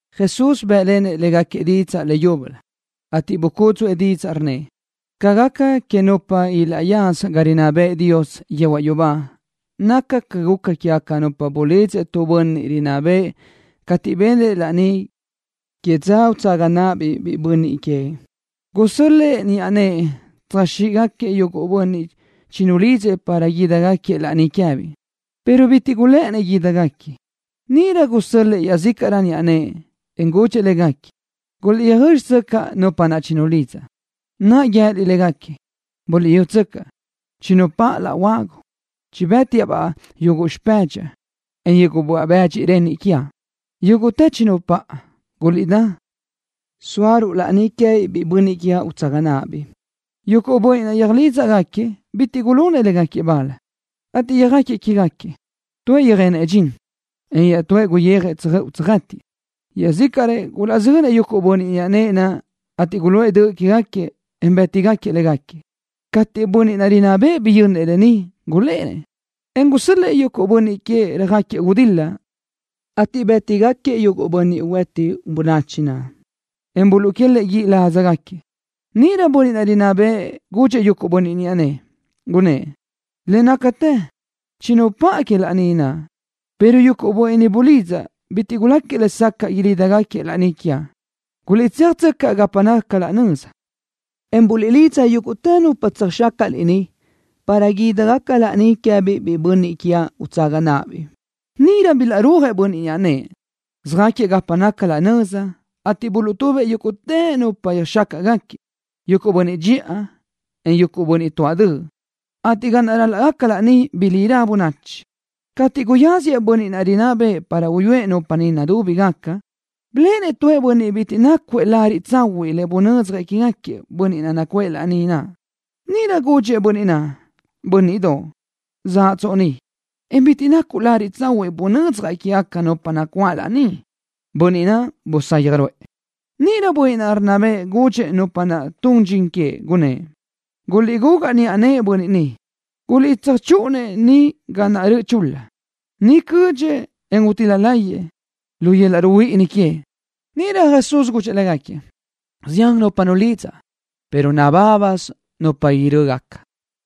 Jesús bë́ʼlenëʼ légaquiëʼ didzaʼ leyúbölö, ateʼ bucúdzuʼë didzaʼ, rnnëʼ: —Ca gaca quégaca nupa ilaʼyaza ga rinná bëʼë Dios yehuaʼ yubá naca ca guca quégaca nupa bulidzëʼ tu bönniʼ rinná bëʼë cateʼ benëʼ laní que dza utsaga náʼabiʼ biʼi bönniʼ queëʼ. Gusö́l-lëʼë niʼa nëʼë tsöjxíʼgaquiëʼ yuguʼ bönniʼ chinulidzëʼ para guídagaquiëʼ laní queë́biʼ, pero bitiʼ gulë́ʼënëʼ guídagaquiëʼ. Níʼirö gusö́l-lëʼë iaʼzícaʼrëʼ niʼa nëʼë, en gudxëʼ légaquiëʼ: “Guliʼtsöjö́dxitsöcaʼ nupa naʼ chinulidzaʼ, naʼ guië́liʼ légaquiëʼ: Buliʼyútsöcaʼ, chinupáʼa laʼ huagu. Chibë́tiaʼ-baʼ yuguʼ xpëdxaʼ, en yuguʼ böaʼ bëdxi renniʼ quiaʼ. Yúguʼtë chinupáʼa. Guliʼdá, sóaruʼ laní queë́biʼ biʼi bönniʼ quiaʼ utsaga náʼabiʼ.” Yuguʼ bönniʼ naʼ yöjlídzagaquiëʼ bitiʼ gulunëʼ légaquiëʼ bal, ateʼ yöjáquiëʼ que queë́gaquiëʼ. Tuëʼ yöjenëʼ dxin, en iaʼtúëʼ guyijëʼ tsöjöʼu tsöjë́tiʼë. Iaʼzícaʼrëʼ gulaʼzönëʼ yuguʼ niʼa nëʼë naʼ, ateʼ guluʼë döʼ quégaquiëʼ, en bë́tgaquiëʼ légaquiëʼ. Cateʼ bönniʼ naʼ rinná bëʼë biyönnëʼ lë ni, gulénëʼ, en gusö́l-lëʼë yuguʼ bönniʼ queëʼ röjáquiëʼ gudil-la, ateʼ bë́tigaquiëʼ yuguʼ bönniʼ hueti bönachi naʼ, en buluʼquélëʼë guíʼ ládzagaquiëʼ. Níʼirö bönniʼ naʼ rinná bëʼë gudxëʼ yuguʼ niʼa nëʼë, gunnë́ʼ: “Le nácatë chinupáʼa que laní naʼ, pero yuguʼ bönniʼ bulidzaʼ bitiʼ guláquiëʼ lesacaʼ guídagaquiëʼ laní quiaʼ. Guliʼtséajtsöcaʼ gapa naca laʼ nöza, en buliʼlidza yúguʼtë nupa tsöjxácaʼliʼ niʼ para guídagaca laní queë́biʼ biʼi bönniʼ quiaʼ utsaga náʼabiʼ.” Níʼirö bilaʼrúajëʼ niʼa nëʼë naʼ, söjáquiëʼ gapa naca laʼ nöza, ateʼ buluʼtubëʼ yúguʼtë nupa yöjxácaʼgaquiëʼ, yuguʼ bönniʼ dxiʼa, en yuguʼ bönniʼ tuáʼ döʼ, ateʼ ga naʼ raca laní bilírö bönachi. ’Cateʼ guyáziëʼ bönniʼ naʼ rinná bëʼë para uyúëʼ nupa niʼ nudúbigaca, biléʼenëʼ tu bönniʼ bitiʼ nácuëʼ lariʼ tsahuiʼ le bunödzjëʼ quégaquiëʼ bönniʼ nacuʼë laní naʼ. Níʼirö gudxëʼ bönniʼ naʼ: “Bö́nniʼdoʼ, ¿zóatsoʼ ni, en bitiʼ nacuʼ lariʼ tsahuiʼ bunödzjaʼ quégaca nupa nacuáʼ laní?” Bönniʼ naʼ busayaj ruʼë. Níʼirö bönniʼ naʼ rinná bëʼë gudxëʼ nupa naʼ tun xichinëʼ, gunnë́ʼ: “Guliʼgugaʼ niʼa nëʼë bönniʼ ni. Guliʼtsöjchúʼun-nëʼ níʼilö ga naʼ röʼö chul-la. Niʼ cödxëʼ, en utíl-la láyëʼë, lu yöl-laʼ ruhuíʼini queëʼ.” Níʼirö Jesús gudxëʼ légaquiëʼ: —Zian nupa nulidzaʼ, pero nabábasö nupa ilaʼrö́gaca.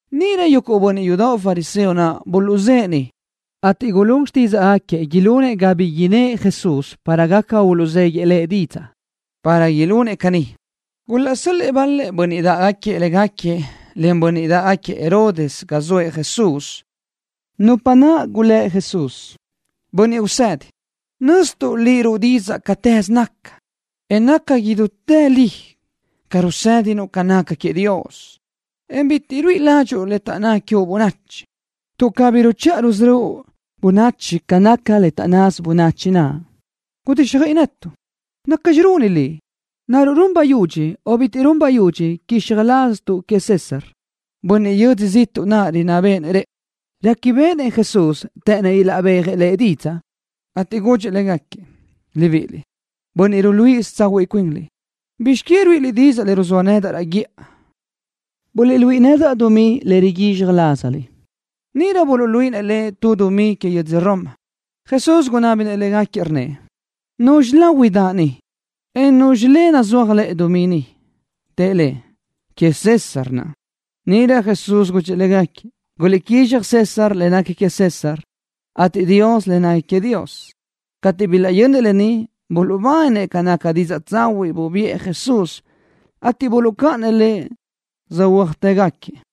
Níʼirö yuguʼ bönniʼ yudoʼ fariseo naʼ buluʼzë́ʼë niʼ, ateʼ gulún xtídzaʼgaquiëʼ ilunëʼ ga bi innë́ʼ Jesús para gaca uluʼzéguiëʼ Lëʼ didzaʼ. Para ilunëʼ caní, gulaʼsö́l-lëʼë bal-lëʼ bönniʼ dáʼgaquiëʼ légaquiëʼ, len bönniʼ dáʼgaquiëʼ Herodes, ga zoëʼ Jesús, nupa naʼ gulë́ Jesús: —Bönniʼ Usedi, nöztuʼ Liʼ ruʼu didzaʼ cátëze naca, en naca idútë li ca rusédinuʼ ca naca queëʼ Dios, en bitiʼ ruíʼi ládxuʼu le taʼnná quiuʼ bönachi, tuʼ cabí ruchiʼa rusörö́uʼ bönachi ca naca le taʼnnasö bönachi naʼ. Gudíxjöiʼi netuʼ. ¿Nacxi runi liʼ? ¿Naruʼ run bayudxi, o bitiʼ run bayudxi quizxaj laztuʼ queëʼ César, bönniʼ yödzö ziʼtuʼ naʼ rinná béʼenëʼ rëʼu? Réquibeʼenëʼ Jesús të́ʼënnëʼ uluʼbéajëʼ Lëʼ didzaʼ, ateʼ gudxëʼ légaquiëʼ: —Libiʼiliʼ, bönniʼ ruluíʼisö tsahuiʼ cuinliʼ, ¿bizx que ruíʼiliʼ didzaʼ le ruzóa nedaʼ raʼ guíʼa? Buliʼluíʼi nedaʼ dumí le riguízxaj lázaliʼ. Níʼirö buluʼluíʼinëʼ Lëʼ tu dumí que yödzö Roma. Jesús gunábinëʼ légaquiëʼ, rnnëʼ: —¿Nuzxi lahui daʼ ni, en nuzxi le nazúaj lëʼe dumí ni? Tëʼ Lëʼ: —Queëʼ César naʼ. Níʼirö Jesús gudxëʼ légaquiëʼ: —Guliʼguízxjëʼ César le nequi queëʼ César, ateʼ Dios le nequi queëʼ Dios. Cateʼ bilaʼyönnëʼ lë ni, buluʼbáninëʼ ca naca didzaʼ tsahuiʼ bubiʼë Jesús, ateʼ buluʼcáʼanëʼ Lëʼ, söhuö́ajtëgaquiëʼ.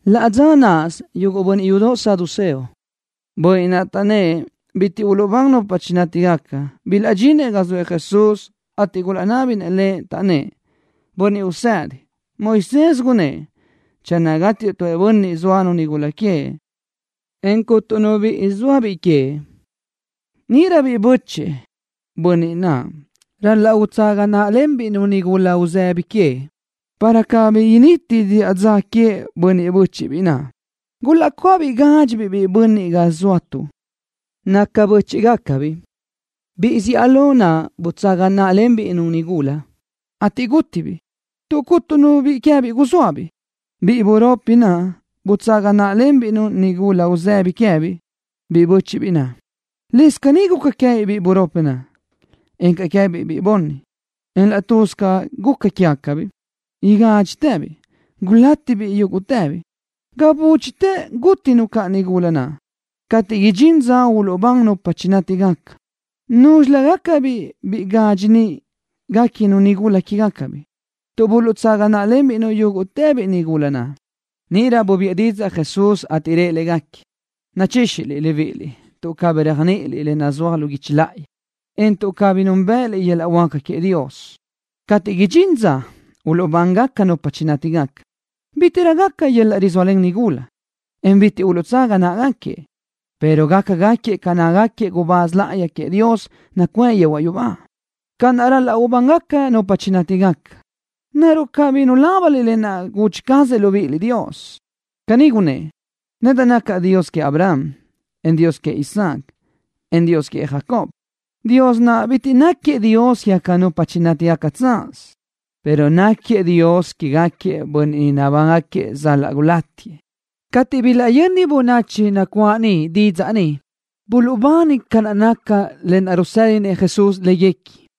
Laʼ dza náʼasö yuguʼ bönniʼ yudoʼ saduceo, bönniʼ naʼ taʼnnë́ʼ bitiʼ uluʼbán nupa chinátigaca, bilaʼdxinëʼ ga zoëʼ Jesús, ateʼ gulaʼnábinëʼ Lëʼ, taʼnnë́ʼ: —Bönniʼ Usedi, Moisés gunnë́ʼ: “Channö gátiëʼ tu bönniʼ zóanu nigula queëʼ, en cuntu nu biʼi zóabiʼ queëʼ, níʼirö biʼi bö́chëʼë bönniʼ naʼ ral-laʼ utsaga náʼalenbiʼ-nu nigula uzëbi queëʼ, para cabí initi diʼa dza queëʼ bönniʼ bö́chiʼbiʼ naʼ.” Gulaʼcuáʼabiʼ gadxi biʼi bönniʼ ga zóatuʼ, naca bö́chiʼgacabiʼ. Biʼi zíʼalö naʼ butsaga náʼalenbiʼ-nu nigula, ateʼ gútitëbiʼ. Tuʼ cuntu nu biʼi queë́biʼ zóabiʼ, biʼi buropi naʼ butsaga náʼalenbiʼ-nu nigula uzëbi queë́biʼ biʼi bö́chiʼbiʼ naʼ. Lëscaʼ caní guca queë́biʼ biʼi buropi naʼ, encaʼ queë́biʼ biʼi bunni, en laʼ tuz ca guca quégacabiʼ igádxitëbiʼ, gulátibiʼ yúguʼtëbiʼ. Ga búdxitë gútinu caʼ nigula naʼ. Cateʼ idxín dza uluʼbán nupa chinátigaca, ¿núzxilögacabiʼ biʼi gadxi niʼ guéquinu nigula naʼ queë́biʼ, tuʼ buluʼtsaga náʼalenbiʼ-nu yúguʼtëbiʼ nigula naʼ? Níʼirö bubiʼë didzaʼ Jesús, ateʼ rëʼ légaquiëʼ: —Nachíxiliʼ libíʼiliʼ tuʼ cabí réajniʼiliʼ le nazúaj lu guichi láʼayi, en tuʼ cabí núnbëʼëliʼ yöl-laʼ huáca queëʼ Dios. Cateʼ idxín dza uluʼbán nupa chinátigaca, bítiʼrö gaca yöl-laʼ rizóalen nigula, en bitiʼ uluʼtsaga náʼagaquiëʼ, pero gácagaquiëʼ ca nácagaquiëʼ gubáz láʼayi queëʼ Dios nacuʼë yehuaʼ yubá. Ca naʼ ral-laʼ uluʼbán nupa chinátigaca, ¿naruʼ cabí nulábaniliʼ lë naʼ gudxi cazëʼ Dios libíʼiliʼ? Caní gunnë́ʼ: “Nedaʼ nacaʼ Dios queëʼ Abraham, en Dios queëʼ Isaac, en Dios queëʼ Jacob.” Dios naʼ bitiʼ náquiëʼ Dios quégaca nupa nátigaca tsaz, pero náquiëʼ Dios quégaquiëʼ bönniʼ ni nabángaquiëʼ sal-laʼ gulátiëʼ. Cateʼ bilaʼyöni bönachi nacuáʼ niʼ didzaʼ ni, buluʼbani ca naca lë naʼ rusédinëʼ Jesús léguequi.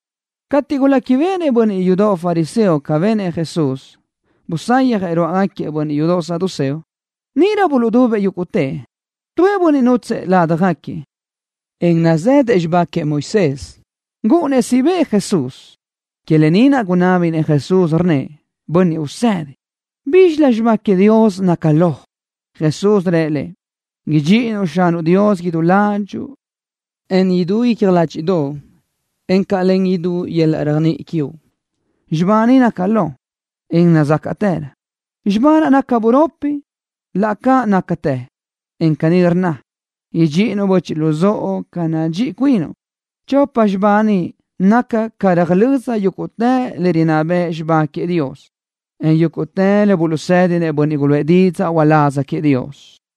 Cateʼ guléquibeʼenëʼ bönniʼ yudoʼ fariseo ca benëʼ Jesús, busayjëʼ ruáʼagaquiëʼ bönniʼ yudoʼ saduceo, níʼirö buluʼdubëʼ yúguʼtëʼ. Tuëʼ bönniʼ nútsëʼë ládjagaquiëʼ, en nazëdëʼ xibá queëʼ Moisés, gúʼunnëʼ siʼ bëʼë Jesús. Que lë ni naʼ gunábinëʼ Jesús, rnnëʼ: —Bönniʼ Usedi, ¿bízxilö xibá queëʼ Dios naca lo? Jesús rëʼ lëʼ: —Idxiʼinuʼ Xanuʼ Dios idú ládxuʼu, en idú icja ládxiʼdoʼo, encaʼ len idú yöl-laʼ réajniʼi quiuʼ. Xibá ni naca lo, en nazácaʼtërö. Xibá naʼ naca buropi, laʼ ca nácatë, en caní rnna: “Idxíʼinuʼ böchiʼ luzóʼo ca nadxíʼi cuinuʼ.” Chopa xibá ni nácagaca ga röjlö́z yúguʼtë le rinná bëʼ xibá queëʼ Dios, en yúguʼtë le buluʼsédinëʼ bönniʼ guluʼë didzaʼ uláz queëʼ Dios.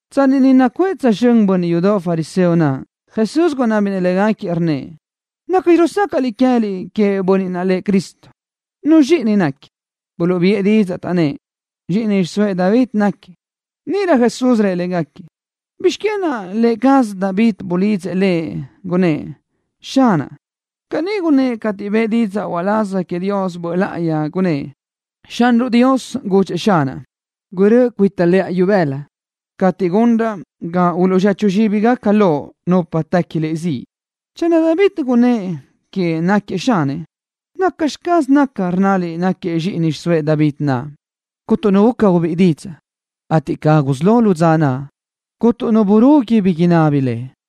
Tsanni niʼ nacuʼë tsözxö́n bönniʼ yudoʼ fariseo naʼ, Jesús gunábinëʼ légaquiëʼ, rnnëʼ: —¿Nacxi rusácaʼliʼ queë́liʼ queëʼ Bönniʼ naʼ lëʼ Cristo? ¿Nuzxi zxíʼini náquiëʼ? Buluʼbiʼë didzaʼ, taʼnnë́ʼ: —Zxiʼini xiʼsóëʼ David náquiëʼ. Níʼirö Jesús rëʼ légaquiëʼ: —¿Bizx que naʼ lë cazëʼ David bulidzëʼ Lëʼ, gunnë́ʼ: “Xanaʼ”? Caní gunnë́ʼ cateʼ niʼ bëʼë didzaʼ uláz queëʼ Dios Böʼ Láʼayi, gunnë́ʼ: Xanruʼ Dios gudxëʼ Xanaʼ: “Gurö́ʼö cuita lëʼa ibëla, cateʼ gunraʼ ga uluʼzechu zxíbigaca Loʼ nupa tequi Liʼ ziʼ.” Channö David naʼ gunnë́ʼ queëʼ náquiëʼ Xanëʼ, ¿nacxi caz naca, rnnaliʼ náquiëʼ zxíʼini xiʼsóëʼ David naʼ? Cuntu nu guca ubíʼi didzaʼ, ateʼ ga gusí lo dza naʼ, cúnturö nu burugui bi inábini Lëʼ.